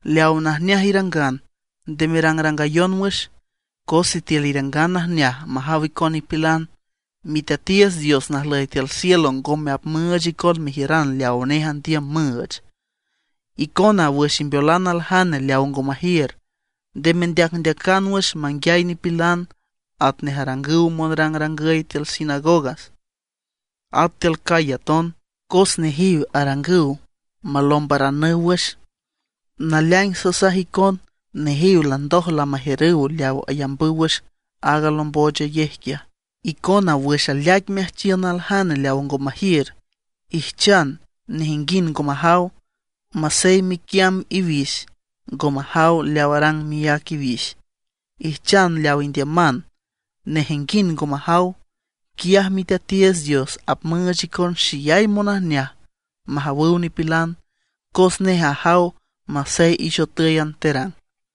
’Leaw najneaj irangan, nde merangrangayon wüx; cos sitiül irangan najneaj majaw icon nipilan, Miteatiiüts Dios najlüy tiül cielo ngome apmüüch icon mejiüran leawa nej andiüm müüch. Icona wüx imbeolan aljane leaw ngo majiür, nde mendeacndeacan wüx manguiay nipilan matnej arangüw monrangrangüy tiül sinagogas, at tiül calle aton. Cos nejiw arangüw malombaranüw wüx. Naleaing sasaj icon, nejiw landoj lamajiürüw leaw ayambüw wüx aaga alomboochayej quiaj. Icona wüx aleaic meajchiün aljane leaw ngo majiür, ijchan nejinguind ngo majaw, masey miquiamb iwix ngo majaw leaw arang miác iwix. Ijchan leaw indiüman, nejenguind ngo majaw. Quiaj Miteatiiüts Dios apmüüch icon xeyay monajneaj majawüw nipilan, cos nej ajaw masey ixotǘyan terang.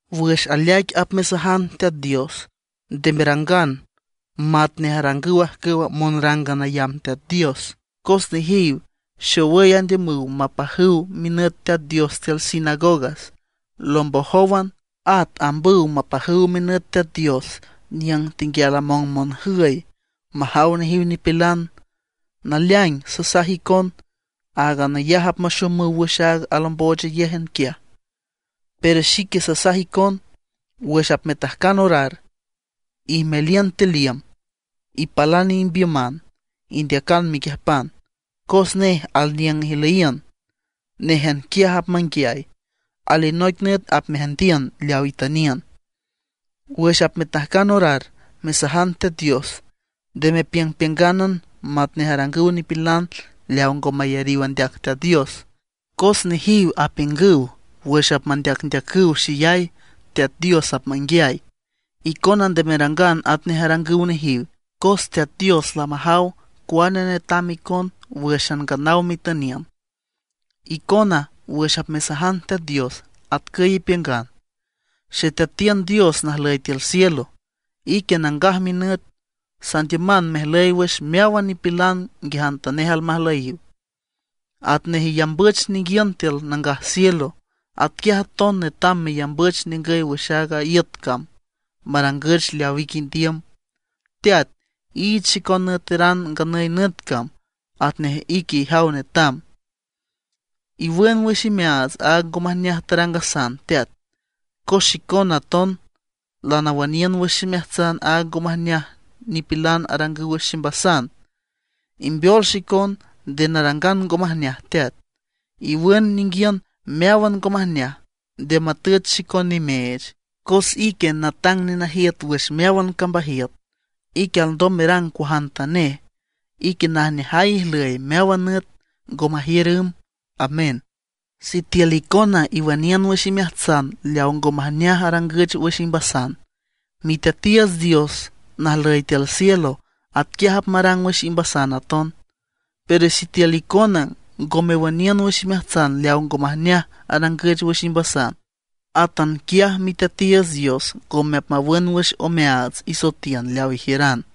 ’Wüx aleaic apmesajan Teat Dios nde merangan matnej arangüw ajcüwa monrángan ayamb Teat Dios, cos nejiw xowüy andiümüw mapajüw minüt Teat Dios tiül sinagoga lombojówan. At ambüw mapajüw minüt Teat Dios niüng tenguial among monjüy, majaw nejiw nipilan. Naleaing sasaj icon áagan ayaj apmaxomüw wüx aaga alomboochayej quiaj. Pero xique sasaj icon, wüx apmetajcan orar ijmeliün tiül iüm, ipalan imbiüman, indeacan mequiüjpan, cos nej alniüng ijlüyiün; néjan quiaj apmanguiay. Alinoic nüt apmeajndiün leaw itüniün. ’Wüx apmetajcan orar mesajan Teat Dios nde mepiüngpiüngánan matnej arangüw nipilan leaw ngo mayariw andeac Teat Dios, cos nejiw apiüngüw wüx apmandeacndeacüw xeyay, Teat Dios apmanguiay. Icona nde merangan atnej arangüw nejiw, cos Teat Dios lamajaw cuane netam icon wǘxan nganaw metüniün. Icona wüx apmesajan Teat Dios, atcüy ipiüngan: Xeteatiün Dios najlüy tiül cielo, ique nangaj minüt. Sandiüman mejlüy wüx meáwan nipilan nguiajantanej almajlüyiw. Atnej iyambüch ninguiün tiül nangaj cielo, atquiaj aton netam meyambüch ningüy wüx aaga iüt cam, marangüch leaw ique indiüm. Teat, iich xicon nüeteran nganüy nüt cam, atnej ique ijaw netam. Iwün wüx imeaats aaga ngo majneaj tarangasan Teat, cos xicona aton lanawüniün wüx ximeajtsan aaga ngo majneaj nipilan arangüw wüx ximbasan. Imbeol xicon nde narangan ngo majneaj Teat. Iwün ninguiün meáwan ngo majneaj, nde matüch xicon nimeech. Cos ique natang nenajiüt wüx meáwan cambajiüt; ique alndom merang cuajantanej. Ique najneajay ijlüy meáwan nüt, ngo majiür ümb. Amén. ’Sitiül icona iwüniün wüx imeajtsan leaw ngo majneaj arangüch wüx imbasan, Miteatiiüts Dios najlüy tiül cielo atquiaj apmarang wüx imbasan aton. Pero sitiül icona ngo mewüniün wüx imeajtsan leaw ngo majneaj arangüch wüx imbasan, átan quiaj Miteatiiüts Dios ngome apmawün wüx omeaats isoetiün leaw ijiüran.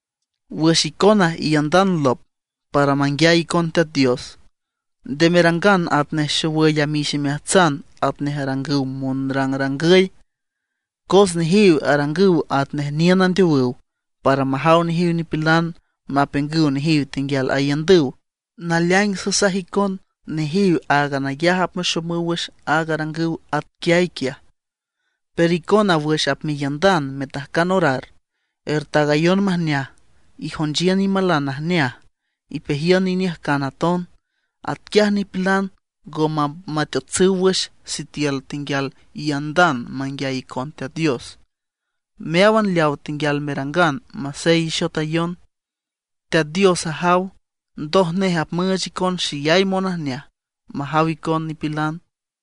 ’Wüx icona iiündan lop para manguiay icon Teat Dios, nde merangan atnej xowüy amix imeajtsan atnej arangüw monrangrangüy, cos nejiw arangüw atnej niün andeowüw para majaw nejiw nipilan mapiüngüw nejiw tenguial aiündüw. Naleaing sasaj icon nejiw áagan ayaj apmaxomüw wüx aag arangüw atquiay quiaj. Pero icona wüx apmeiündan metajcan orar, ertaagayon majneaj, ijonchiün imalan najneaj, ipejiün iniüjcan aton. Atquiaj nipilan ngome apmateotsüw wüx sitiül icona tenguial iiündan manguiay icon Teat Dios. Meáwan leawa tenguial merangan masey ixotayon, Teat Dios ajaw, ndoj nej apmüüch icon xeyay monajneaj majaw icon nipilan.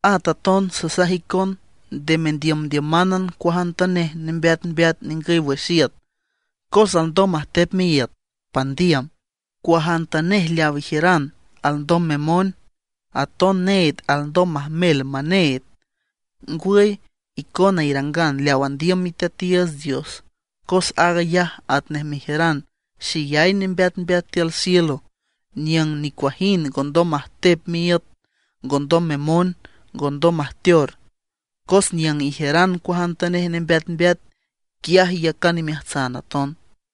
’At aton sasaj icon nde mendiümdiümánan cuajantanej nembeatmbeat ningüy wüx iüt, cos alndom majtep miíüt pandiüm. Cuajantanej leaw ijiüran alndom memoen, aton need alndom majmel maneed. Ngwüy icona irangan leaw andiüm Miteatiiüts Dios cos aag ayaj atnej mejiüran xeyay nembeatmbeat tiül cielo niüng nicuajind ngondom majtep miiüt, ngondom memoen, ngondom majteor. Cos niüng ijiüran cuajantanej nembeatmbeat, quiaj iyacan imeajtsan aton.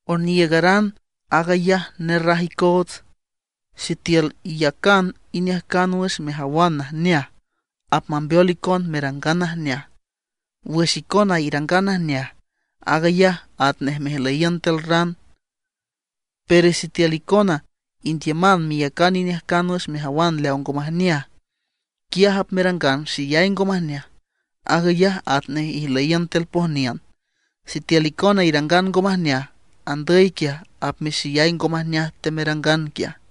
’Oniiügaran aag ayaj nerraj icoots. Sitiül iyacan iniüjcan wüx mejawan najneaj, apmambeol icon merangan najneaj. Wüx icona irangan najneaj aag ayaj atnej mejlüyiün tiül ran. Pero sitiül icona indiüman meyacan iniüjcan wüx mejawan leaw ngo majneaj, quiaj apmerangan xeyay ngo majneaj; aag ayaj atnej ijlüyiün tiül pojniün. Sitiül icona irangan ngo majneaj, andüy quiaj apmexeyay ngo majneaj temerangan quiaj.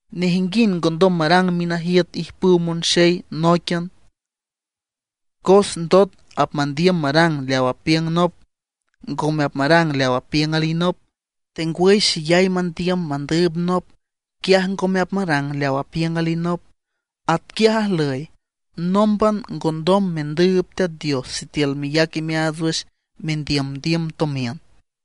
’Nejinguind ngondom marang minajiüt ijpüw monxey nóiquian, cos ndot apmandiüm marang leaw apiüng nop, ngome apmarang leaw apiüng alinop. Tengwüy xeyay mandiüm mandüüb nop, quiaj ngome apmarang leaw apiüng alinop. Atquiaj ajlüy, nómban ngondom mendüüb Teat Dios sitiül meyac imeaats wüx mendiümdiüm tomiün.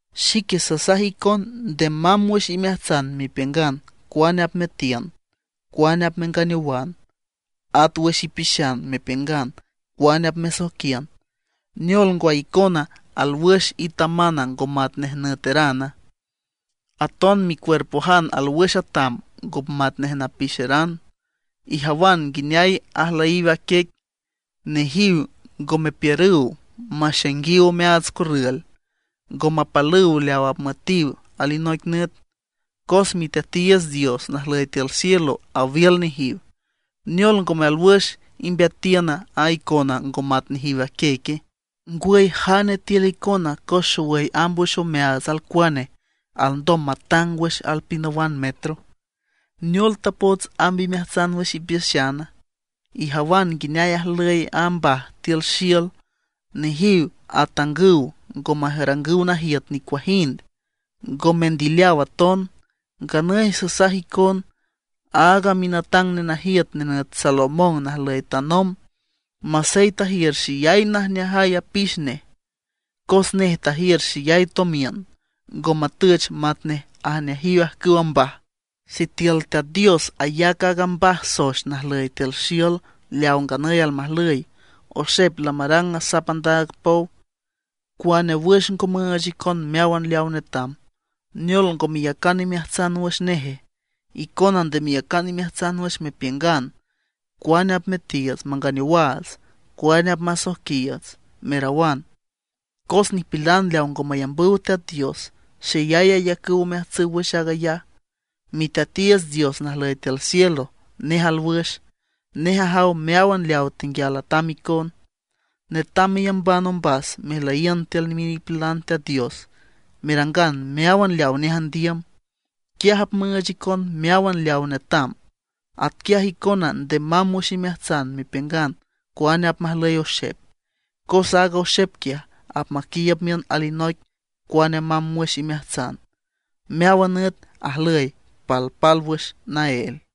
’Xique sasaj icon nde mamb wüx imeajtsan mepiüngan cuane apmeatiün, cuane apmenganeowan, at wüx ipixan mepiüngan cuane apmesoijquiün. ¿Neol ngwa, icona alwüx itaman ngo matnej nüeteran; aton micuerpojan alwüx atam ngo matnej napixeran? Ijawan nguineay ajlüyiw a quiec, nejiw ngo mepiürüw maxainguiw omeaats corrül, ngo mapalüw leaw apmüetiw alinoic nüt; cos Miteatiiüts Dios najlüy tiül cielo awiül nejiw. ¿Neol, ngome alwüx imbeatiün a icona ngo mat nejiw a quieque? ¿Ngwüy jane tiül icona cos xowüy amb wüx omeaats alcuane, alndom matang wüx alpinawan metro? ’¿Neol tapots amb imeajtsan wüx ipixana? Ijawan nguineay ajlüy a mbaj tiül xiül. Nejiw atangüw ngo marangüw najiüt nicuajind, ngo mendileaw aton. Nganüy sasaj icon, aaga minatang nenajiüt nenüt Salomón najlüy tanomb, masey tajiür xeyay najneajay apix nej cos nej tajiür xeyay tomiün, ngo matüch matnej ajneajiw ajcüwa mbaj. Sitiül Teat Dios ayac aaga mbaj soex najlüy tiül xiül leaw nganüy almajlüy, oxep lamarang asap andaab pow, cuane wüx ngo müüch icon meáwan leawa netam. ¿Neol ngo meyacan imeajtsan wüx neje? Icona nde meyacan imeajtsan wüx mepiüngan: “¿Cuane apmetiiüts manganeowaats, cuane apmasoijquiiüts?” merawan. Cos nipilan leaw ngo mayambüw Teat Dios, xeyay ayacüw omeajtsüw wüx aag ayaj. Miteatiiüts Dios najlüy tiül cielo, nej alwüx; nej ajaw meáwan leaw tenguial atam icon. Netam meyamban ombas mejlüyiün tiül minipilan Teat Dios, merangan meáwan leawa nej andiüm. Quiaj apmüüch icon meáwan leawa netam. Atquiaj icona nde mamb wüx imeajtsan mepiüngan cuane apmajlüy oxep, cos aaga oxep quiaj apmaquiiüb miün alinoic cuane mamb wüx imeajtsan. Meáwan nüt ajlüy palpálwüx naél.